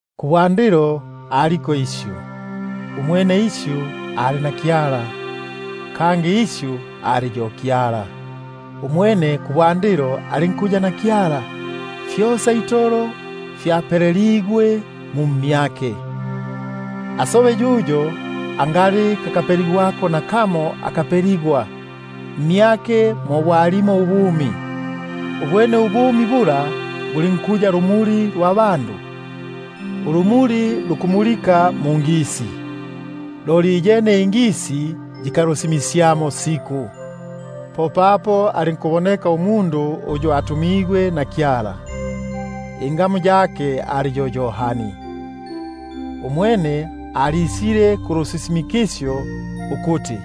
Kubwandilo aliko Isyu; umwene Isyu ali na Kyala; kangi Isyu ali yo Kyala. Umwene kubwandilo alinkuya na Kyala. Fyosa itolo fyapeleligwe mu mmyake, asobe yuyo angali kakapeligwako nakamo aka kapeligwe. Mmyake mo bwalimo ubumi, ubwene ubumi bula bulinkuya lumuli lwa bandu. Ulumuli lukumulika mungisi, loli iyene ingisi yilinkusita nukulwagania. Alinkuboneka umundu uyu atumigwe na Kyala, ingamu yake ali yo Yohani. Umwene alisile kulusisimikisyo, ukuti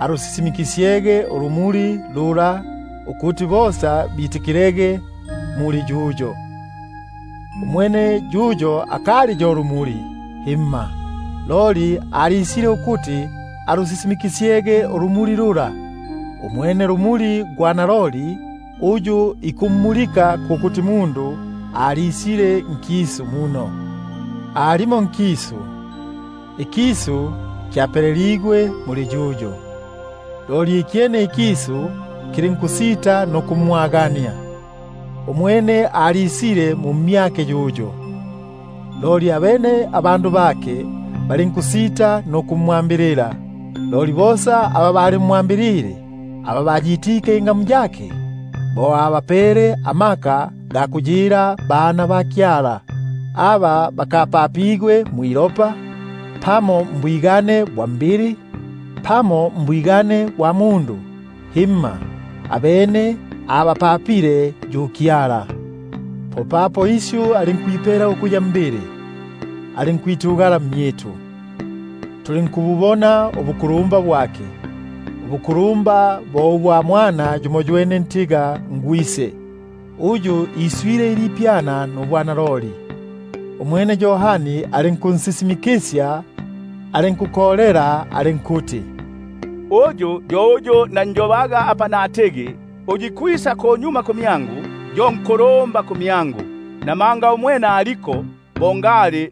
ansisimikisye ulumuli lula, ko kuti bosa bitikilege muli yuyo. Umwene yuyo akali yo lumuli, loli alisile ukuti ansisimikisye ulumuli lula. Umwene lumuli gwa naloli, uyu ikummulika umundu gwesa, alisile nkisu. Alimo nkisu, ikisu kyapeleligwe muli yuyo, ikyene ikisu lulinkusita nukumwagania. Umwene alisile mmyake, loli abene abandu bake balinkusitanukumwa- mbilila. Loli bosa aba balimwambilile, aba bayitike ingamu yake, bo abapele amaka ga kuyila bana ba Kyala; aba bo bakapapigwa mwilopa, pamo mbwigane bwa mbili, pamo mbwigane bwa mundu, loli mwa Kyala. Popapo Isyu alinkuya mbili, alinkwitugala mmyitu; tulinkububona ubukulumba bwake, ubukulumba bo ubwa Mwana yumoywene ntiga nGwise, uyu iswile ilipyana nubwanaloli. Umwene Yohani alinkunsisimikisya, alinkukolela alinkuti: Uyu yo uyu nanjobaga apa natigi, uyu ikwisa kunyuma kumyangu, yo nkulumba kumyangu, namanga aliko bo ngali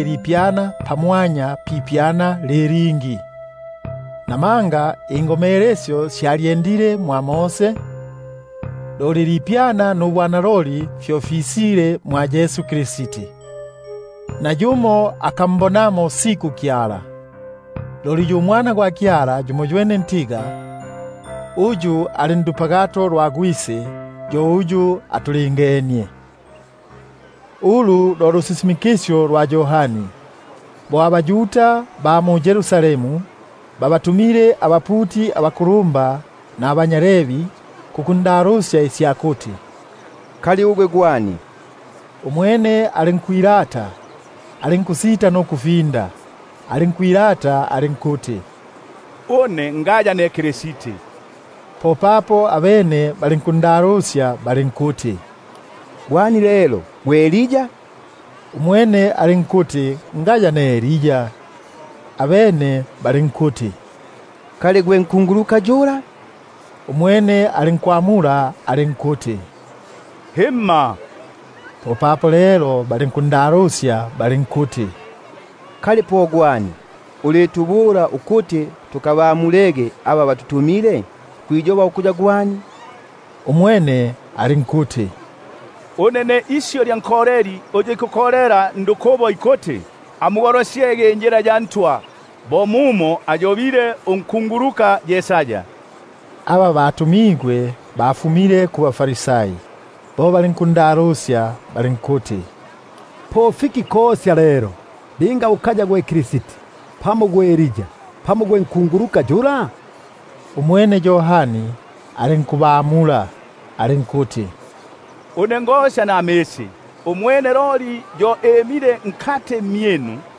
ilipyana pamwanya pipyana li lingi; namanga ululagilo lwalyendile mwa Mose, loli ilipyana nubwanaloli fyo lisile mwa Yesu Kristi. Nayumo akambonamo siku Kyala; loli uMwana gwa Kyala yumoywene ntiga, uyu ali ndupagato lwa Gwise, yo uyu atulingenie. Ulu lo lusisimikisyo lwa Yohani, bo abaYuda ba mu-Yerusalemu babatumile abaputi abakulumba nabanya Levi kukundalusya isya kuti: Kali ugwe gwe ani? Umwene alinkwilata, alinkusita nukulinda, alinkwilata alinkuti: Une ngaya ne Kristi. Popapo abene balinkundalusya balinkuti: Uli mfiki lelo? Gwe Elia? Umwene alinkuti: Ngaya yo une. Abene balinkuti: Kali gwe nkunguluka yula? Umwene alinkwamula alinkuti: Himma. Popapo lelo balinkundalusya balinkuti: Kali po gwe ani, ulitubula ukuti tukabamule aba batutumile? Kwiyoha ukuya gwe ani? Umwene alinkuti: Une ne isyu lya nkoleli uyu ikukolela ndukubo. Amugolosyege injila ya Ntwa, bo mumo ayobile Yesaya unkunguluka. Aba batumigwe bafumile kubaFarisai, bo balinkundalusya balinkuti: Po fiki kosya lelo, linga ukaya gwe Kristi, pamo gwe Elia, pamo gwe nkunguluka yula? Umwene Yohani alinkubamula alinkuti: Une ngosya namisi, loli nkati mmyinu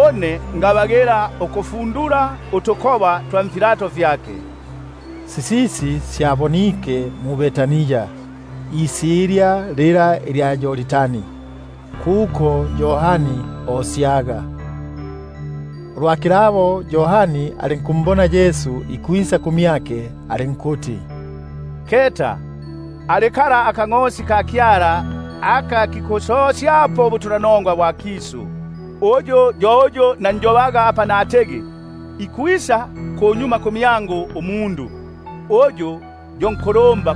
une ngabagila ukufundula utukoba twa nifilato fyake. Sisisi syabonike mu-Betania, isilya fila lya Yordani, kuko Yohani osyaga. Ulwa kilabo, po alinkumbona Yesu ikwisa kumyake, alinkuti: Keta, akangʼosi ka Kyala, aka kikusosyapo ubutu- lanongwa bwa kisu. Uyu yo uyu nanjobaga apa natigi: Ikwisa kunyuma kumyangu umundu, uyu yo nkulumba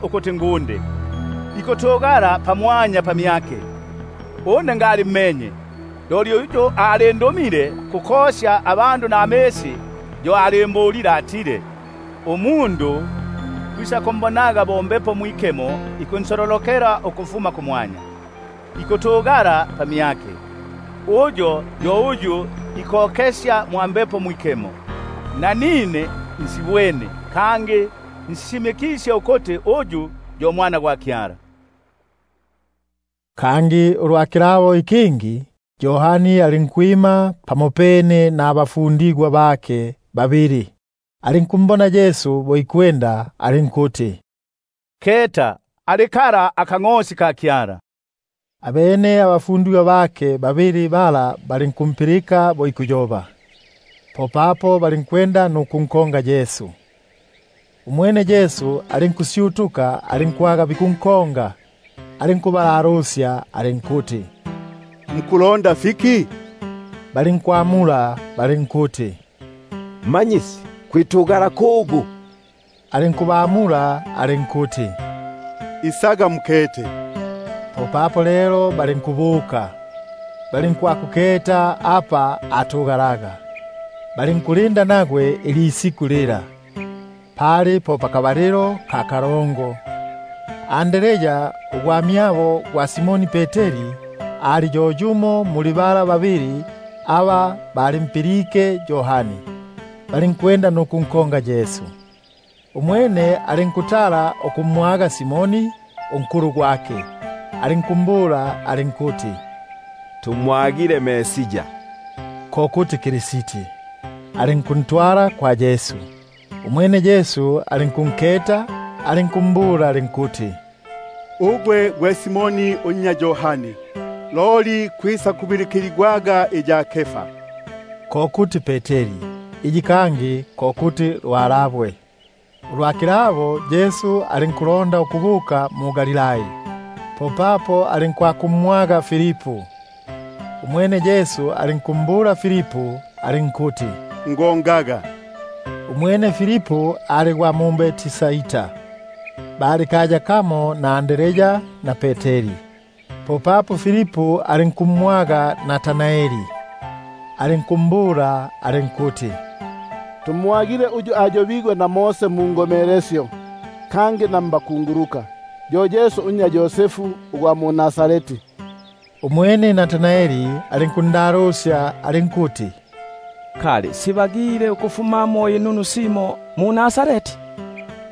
ukuti ngunde, ikutugala pamyake. Nanine ngalimmenye, loli uyu alindumile kukosya namisi, yo alimbulile ukuti: Uyu linga umbwene Mbepo ikunsololokela ikwitugasya pamyake, yo uyu ikosyaga na Mbepo Mwikemo. Nanine nsibwene, kangi nsisisimikisye, ukuti uyu yo Mwana gwa Kyala. Kangi ulwa kilabo, Yohani alinkwima pamopene naba- fundigwa bake babili, alinkumbona Yesu bo ikwenda, alinkuti: Keta akangʼosi ka Kyala! Abene abafundigwa bala babili balinkumpilika bo ikuyoba, popapo balinkunkonga Yesu. Umwene Yesu alinkusyutuka, alinkubabona bikunkonga, alinkubalalusya alinkuti: Mukulonda fiki? Balinkumbula balinkuti: Rabi (ko kuti Mmanyisi), kwitugala kugu? Umwene alinkubabula alinkuti: Isaga mukete. Popapo lelo balinkubuka, balinkwakuketa apa alipo; balinkulinda nagwe ilisiku lila. Pali po pakabalilo ka kalongo. Andrea, ugwamyabo gwa Simoni Peteri, ali yo yumo muli bala babili aba balimpilike Yohani, nukunkonga Yesu. Umwene alinkutala ukumwaga Simoni ugwamyabo, alinku- mbula alinkuti: Tumwagile Mesia (ko kuti Kristi). Alinkuntwala kwa Yesu. Umwene Yesu bo ambwene, alinkumbula alinkuti: Ugwe gwe Simoni unnya Yohani, kwisakubilikiligwaga iya Kefa, (ko kuti Peteri).#Peteri ko kuti lwalabwe. Ulwa kilabo Yesu alinkulonda ukubuka mu-Galilai, alinkumwaga Filipu. Umwene Yesu alinkumbula alinkuti: Ngo- ngaga. Umwene Filipu ali gwa mu-Betsaida, bali kaya kamo na Andrea na Peteri. Popapo Filipu alinkumwaga Natanaeli, alinkumbula alinkuti: Tumwagile uyu ayobigwe na Mose ndulagilo na mbakunguluka, yo Yesu unnya Yosefu ugwa mu-Nazareti. Umwene Natanaeli alinkundalusya alinkuti: Kali sibagile ukufumamo simo inunu mu-Nazareti?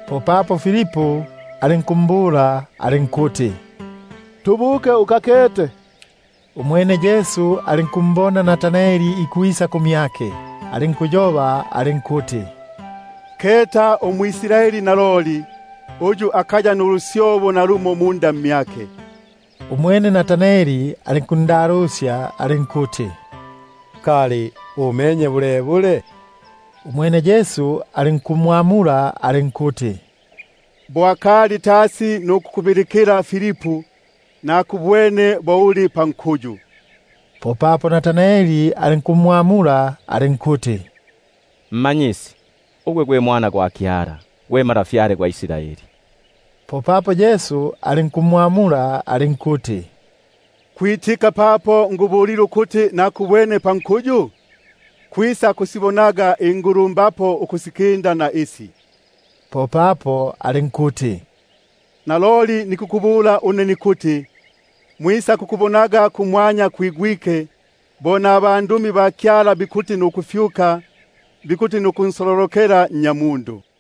Popapo Filipu alinkumbula alinkuti: Tubuke ukakete. Umwene Yesu alinkumbona Natanaeli ikwisa kumyake, alinkunjoba alinkuti: Keta umwʼIsraeli naloli, uyu akaya nulusyobo nalumo mmyake. Umwene Natanaeli alinkundalusya alinkuti: Kali umenye bulebule? Umwene Yesu alinkumwamula alinkuti: Bo akali tasi nukukubilikila Filipu, nakubwene bo uli pankuyu. Popapo Natanaeli alinkumwamula alinkuti: Rabi,#Rabi ko kuti Mmanyisi. ugwe-gwe Mwana gwa Kyala, gwe Ntwa gwa Israeli. Popapo Yesu alinkumwamula alinkuti: Kwitika papo ngubulile ukuti nakubwene pankuyu? Kwisakusibonaga ingulu- mbapo ukusikinda na isi. Popapo alinkuti: Naloliloli nikubabula une nikuti: Mwisakumbonaga kumwanya kwigwike, nabandumi ba Kyala bikuti nukufyuka, bikuti nukunsololokela Nnyamundu.